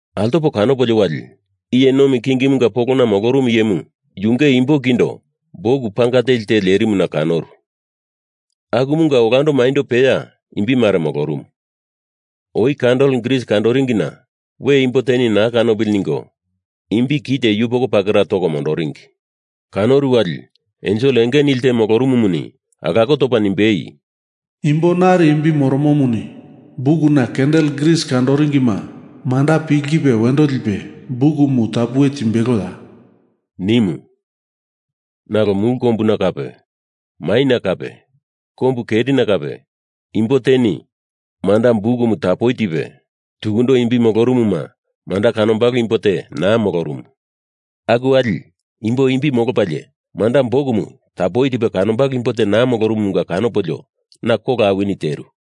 Altopo kanopolio wali iye nomi kingimunga polona molorumu iyemu yunge imbo kindo buk panga teli te lerimuna kanoru, akumunga olando maindo peya imbi mare molorumu. Oi kandel gris kandoringina we imbo te naa kanopili ningo imbi kite yupoko pakera toko mondoringi. Kanoru wali ensel enge nili te molorumumuni alako topa nimbei, “Imbo nari imbi moromomuni bukuna kandel gris kandoringima manda pilkipe wendo lipe bukumu tapuwe timbeloya?” nimu. Nalo mulu kombuna kape maina kape kombu kerina kape imbo teni manda bukumu tapuwe tipe, tukundo imbi molorumuma manda kanombalo imbo te naa molorumu. Aku wali imbo imbi molopalie manda bukumu tapuwe tipe kanombalo imbo te naa molorumumunga kanopolio na kola awini teru.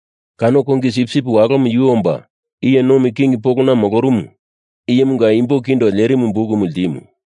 Kano Kongi Sipsip Walomu yu omba iye nomi king polona molorumu iyemunga imbo kindo lerimu bukumu ltimu.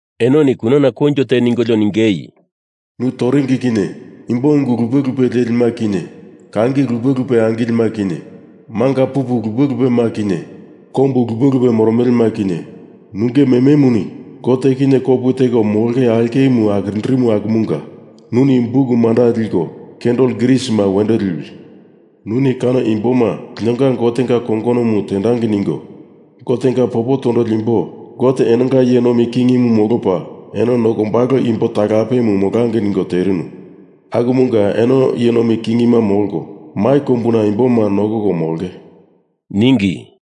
Enoni kunana koinjo te ningolio ningei, “Nu toringi kinye imbo ungu lupe lupe lelima kinye, kangi lupe lupe angilelima kinye, manga pupu lupe lupema kinye, kombu lupe lupe moromelema kinye, nunge mememuni Gote kinye kopu teko molonge aulkemu akirindirinu akumunga nuni buk manda liko kandel grisima wendo liwi. Nuni kano imboma linonga Gotenga kongonomu tendangei ningo Gotenga popo tondoli imbo Gote enonga iye nomi kingimu molopa eno nokombalo imbo talapemu molangei ningo terinu, akumunga eno iye nomi kingima molko mai kombuna imboma nokoko molonge,” ningi.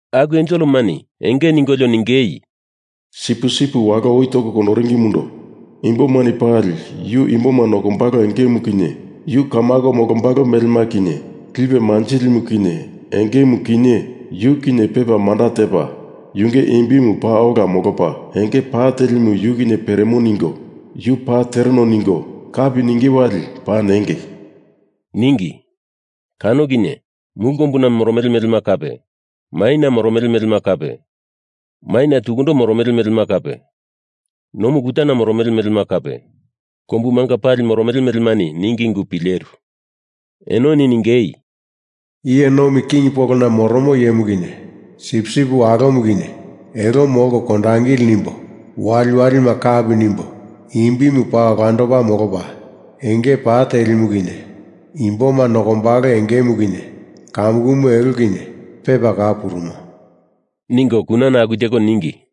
Aku enselemani enge ningolio ningei, “Sipusipu Walo oi toko kondoringimundo imbomani pali Yu imboma nokombalo engemu kinye yu kamako molombalo melema kinye, lipe manjilimu kinye engemu kinye yu kinye pepa manda tepa, yunge imbimu paa ola molopa, enge pa telimu yu kinye peremo ningo yu paa tereno ningo kapi ninge wali paa nengei,” ningi. Kano kinye mulu kombuna moromele melema kape, maina moromele melema kape, maina tukundo moromele melema kape, nomu kutana moromele melema kape, kombumanga pali moromele melemani ningi ungu pileru. Enoni ningei: “Iye nomi king polona moromo iyemu kinye Sipsip Walomu kinye elo molko kondangili nimbo waliwalima kapi nimbo imbimu paa olandopa molopa, enge pa telimu kinye imboma nokombalo engemu kinye kamukumu elo kinye pepa kau purumo,” ningo kunana aku teko ningi.